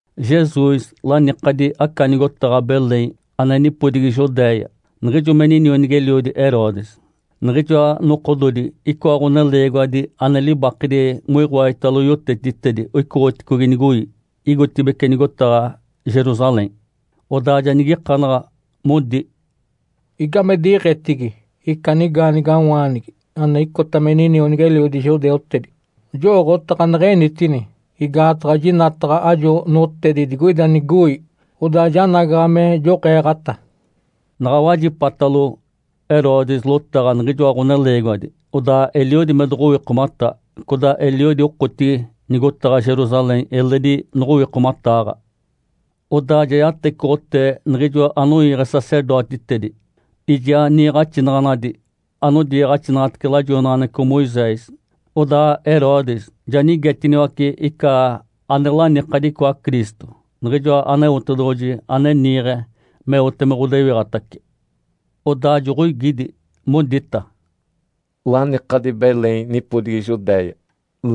Jesus lanikadi aca nigotaɡ̶a Belém ane nipodigi Judéia, niɡ̶ijo me inionigi-eliodi Herodes. Niɡ̶ijoa nokododi icoa ɡ̶oneleegiwadi ane libakedi moiɡ̶oaditalo yotetitedi oicoɡ̶oticogi nigoi, igotibeci nigotaɡ̶a Jerusalém. Odaa ja nigikanaɡ̶a, modi, “Igame diɡ̶etigi ica nigaanigawaanigi ane icota me ninionigi-eliodi judeutedi? Jowooɡ̶otaɡ̶a neɡ̶enitini, igaataɡ̶a jinataɡ̶a ajo notedi digoida nigoi. Odaa janagaɡ̶a me joɡ̶eeɡ̶ata.” Naɡ̶a wajipatalo Herodes lotaɡ̶a niɡ̶ijoa ɡ̶oneleegiwadi, odaa eliodi me doɡ̶owikomata, codaa eliodi okotigi nigotaɡ̶a Jerusalém eledi noɡ̶owikomataaɡ̶a. Odaa ja yatecoɡ̶otee niɡ̶ijo anoiiɡ̶e sacerdotitedi, ijaa niiɡ̶axinaɡ̶anadi anodiiɡ̶axinaɡ̶atece lajoinaɡ̶aneɡ̶eco Moisés. Odaa Herodes ja nigetiniwace ica ane lanikadi icoa Cristo, niɡ̶ijoa Aneotedoɡ̶oji ane niiɡ̶e meote me ɡ̶odewiɡ̶atace. Odaa joɡ̶oigidi, modita, “Lanikadi Belém nipodigi Judéia,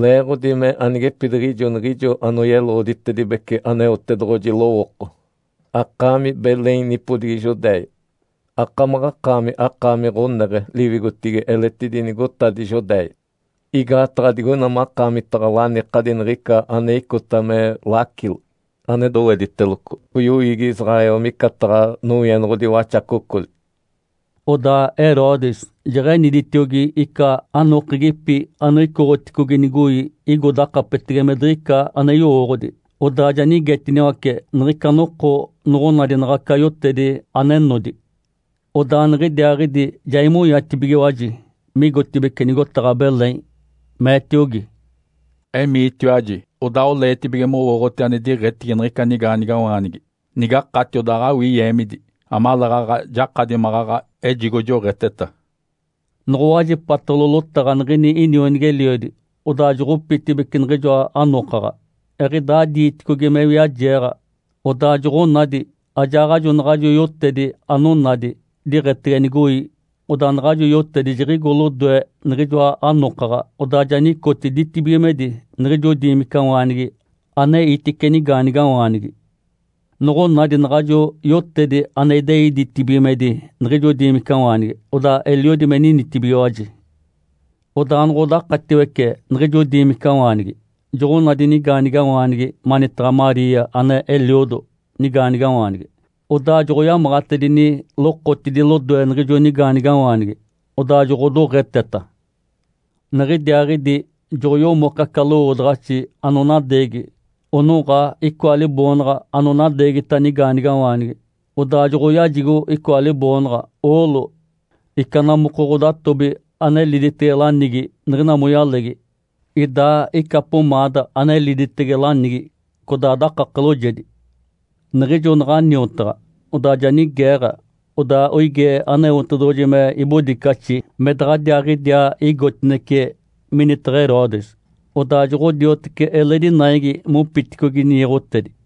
leeɡ̶odi mee anigepidiɡ̶ijo niɡ̶ijo anoyeloɡ̶oditedibece Aneotedoɡ̶oji lowooko, ‘Akaami Belém nipodigi Judéia, akamaɡ̶akaami akaami ɡ̶oneɡ̶e liwigotigi eletidi nigotadi Judéia. Igaataɡ̶a digoina makaamitaɡ̶a lanikadi niɡ̶ica ane icota me lacilo, ane dowediteloco yoiigi Israel micataɡ̶a nowienoɡ̶odi waxacocoli’.” Odaa Herodes jeɡ̶eniditiogi ica anokegipi anoicoɡ̶oticogi nigoi igo dakapetege me diɡ̶ica ane yowooɡ̶odi. Odaa ja nigetiniwace niɡ̶ica noko noɡ̶onadi naɡ̶aca yotedi ane nodi. Odaa niɡ̶idiaaɡ̶idi ja imonyatibigiwaji migotibeci nigotaɡ̶a Belém, meetiogi, “Emiitiwaji, odaa oleetibige mowooɡ̶oti ane diɡ̶etigi niɡ̶ica nigaanigawaanigi. Nigakati, odaa awii yeemidi, amaleeɡ̶aɡ̶a jakadi maɡ̶aɡ̶a ejigo joɡ̶eteta.” Noɡ̶owajipatalo lotaɡ̶a niɡ̶ini inionigi-eliodi, odaa joɡ̶opitibeci niɡ̶ijoa anokaɡ̶a. Eɡ̶idaa diiticogi me wiajeeɡ̶a, odaa joɡ̶onadi ajaaɡ̶ajo naɡ̶ajo yotedi anonadi diɡ̶etege nigoi. Odaa naɡ̶ajo yotedi jiɡ̶igo lodoe niɡ̶ijoa anokaɡ̶a, odaa ja nicoti ditibigimedi niɡ̶ijo diimicawaanigi aneitice nigaanigawaanigi. Noɡ̶onadi naɡ̶ajo yotedi ane idei ditibigimedi niɡ̶ijo diimicawaanigi, odaa eliodi me ninitibigiwaji. Odaa noɡ̶odakatiwece niɡ̶ijo diimicawaanigi, joɡ̶onadi nigaanigawaanigi manitaɡ̶a Maria ane eliodo nigaanigawaanigi. Odaa joɡ̶oyamaɡ̶atedini lokotidi lodoe niɡ̶ijo nigaanigawaanigi, odaa joɡ̶odoɡ̶eteta. Niɡ̶idiaaɡ̶idi joɡ̶oyomoke aca lowoodaɡ̶axi anonadeegi, onoɡ̶a icoa liboonaɡ̶a anonadeegita nigaanigawaanigi. Odaa joɡ̶oyajigo icoa liboonaɡ̶a, oolo, ica namoko ɡ̶odatobi ane liditege lanigi niɡ̶ina moyalegi, idaa ica pomaada ane liditece lanigi codaa dakake loojedi. Niɡ̶ijo naɡ̶a niotaɡ̶a, odaa ja nigeeɡ̶a, odaa oigee Aneotedoɡ̶oji me ibodicaxi me daɡ̶adiaaɡ̶idiaa igotinece minitaɡ̶a Herodes. Odaa joɡ̶odioteci eledi naigi mopiticogi niiɡ̶otedi.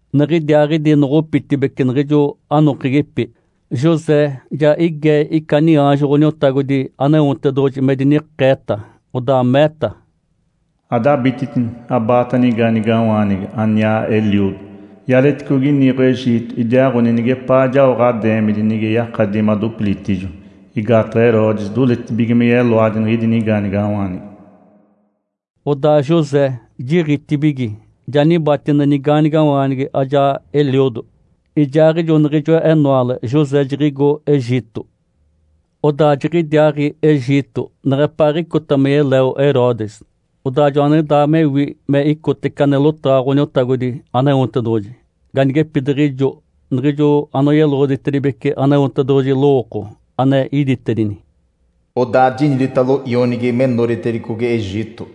Niɡ̶idiaaɡ̶idi noɡ̶opitibeci niɡ̶ijo anokegipi, José ja igee ica niaanjo Ǥoniotagodi Aneotedoɡ̶oji me dinikeeta, odaa meeta, “Adabititini, abaata nigaanigawaanigi, aniaa eliodo, ialeticogi niiɡ̶o Egito! Idiaaɡ̶oni nigepaa jao ɡ̶adeemidi nige yakadi madopilitijo, igaataɡ̶a Herodes doletibige me yeloadi niɡ̶idi nigaanigawaanigi.” Odaa José jiɡ̶itibigi, ja nibatine nigaanigawaanigi ajaa eliodo, ijaaɡ̶ijo niɡ̶ijo enoale José jiɡ̶igo Egito. Odaa jiɡ̶idiaaɡ̶i Egito neɡ̶epaaɡ̶icota me yeleo Herodes, odaa joaniɡ̶idaa mewi me icotece ane lotaɡ̶a Ǥoniotagodi Aneotedoɡ̶oji, ganigepidiɡ̶ijo niɡ̶ijo anoyeloɡ̶oditedibece Aneotedoɡ̶oji lowooko ane iditedini, “Odaa jiniditalo ionigi me noditicogi Egito.”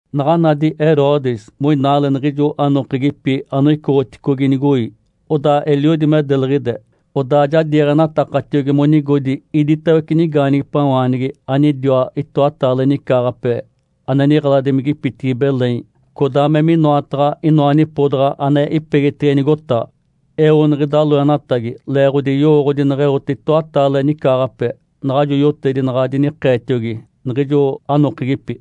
Naɡ̶a nadi Herodes moinaale niɡ̶ijo anokegipi anoicoɡ̶oticogi nigoi, odaa eliodi me deliɡ̶ide. Odaa ja diiɡ̶enatakatiogi monigodi iditawece nigaanigipawaanigi anidiwa itoataale nicaaɡ̶ape, ane niɡ̶eladimigipitigi Belém, codaa me minoataɡ̶a inoa nipodaɡ̶a ane ipegitege nigotaɡ̶a. Eo niɡ̶ida loenatagi leeɡ̶odi yowooɡ̶odi neɡ̶eote itoataale nicaaɡ̶ape naɡ̶ajo yotedi naɡ̶a dinikeetiogi niɡ̶ijo anokegipi.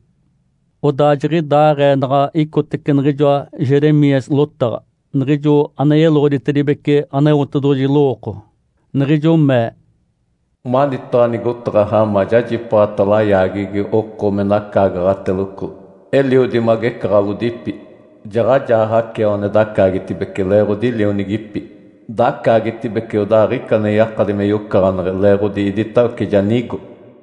Odaa jiɡ̶idaaɡ̶ee naɡ̶a icotece niɡ̶ijoa Jeremias lotaɡ̶a, niɡ̶ijo ane yeloɡ̶oditibece Aneotedoɡ̶oji lowooko, niɡ̶ijo mee, “Manitaɡ̶a nigotaɡ̶a Ramá jajipaaɡ̶ata layaageɡ̶egi oko me nacaagaɡ̶ateloco, eliodi me agecaɡ̶alodipi. Jaɡ̶ajaa Raquel ane dacaagetibece leeɡ̶odi lionigipi. Dacaagetibece, odaa aɡ̶ica ane yakadi me yocaɡ̶aneɡ̶e leeɡ̶odi iditawece ja nigo.”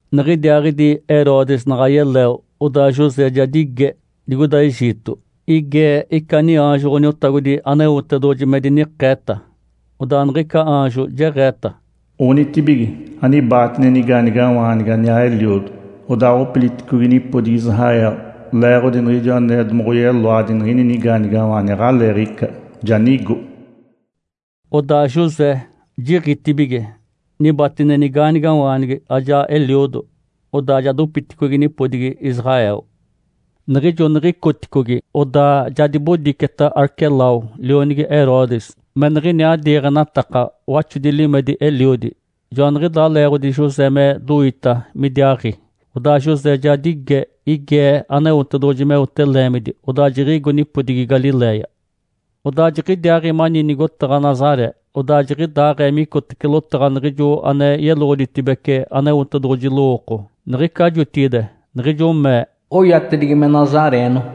Niɡ̶idiaaɡ̶idi Herodes naɡ̶a yeleo, odaa José ja dige digoida Egito. Igee ica niaanjo Ǥoniotagodi Aneotedoɡ̶oji me dinikeeta. Odaa niɡ̶ica aanjo jeɡ̶eeta, “Onitibige, anibaatine nigaanigawaanigi aniaa eliodo, odaaɡ̶opiliticogi nipodigi Israel, leeɡ̶odi niɡ̶ijo ane domoɡ̶oyeloadi niɡ̶ini nigaanigawaanigi aɡ̶aleeɡ̶ica, ja nigo.” Odaa José jiɡ̶itibigi, nibatine nigaanigawaanigi, ajaa eliodo, odaa ja dopiticogi nipodigi Israel. Niɡ̶ijo niɡ̶icoticogi, odaa ja dibodiceta Arquelau, lionigi Herodes, me niɡ̶iniaa diiɡ̶enataka waxodi limedi eliodi. Joaniɡ̶idaa leeɡ̶odi José me doita midiaaɡ̶i. Odaa José ja dige, igee Aneotedoɡ̶oji meote leemidi. Odaa jiɡ̶igo nipodigi Galiléia. Odaa jiɡ̶idiaaɡ̶i mani nigotaɡ̶a Nazaré. Odaa jiɡ̶idaaɡ̶ee micotece lotaɡ̶a niɡ̶ijo ane yeloɡ̶oditibece Aneotedoɡ̶oji lowooko niɡ̶ica jotigide, niɡ̶ijo mee, “Oyatedigi me Nazareeno.”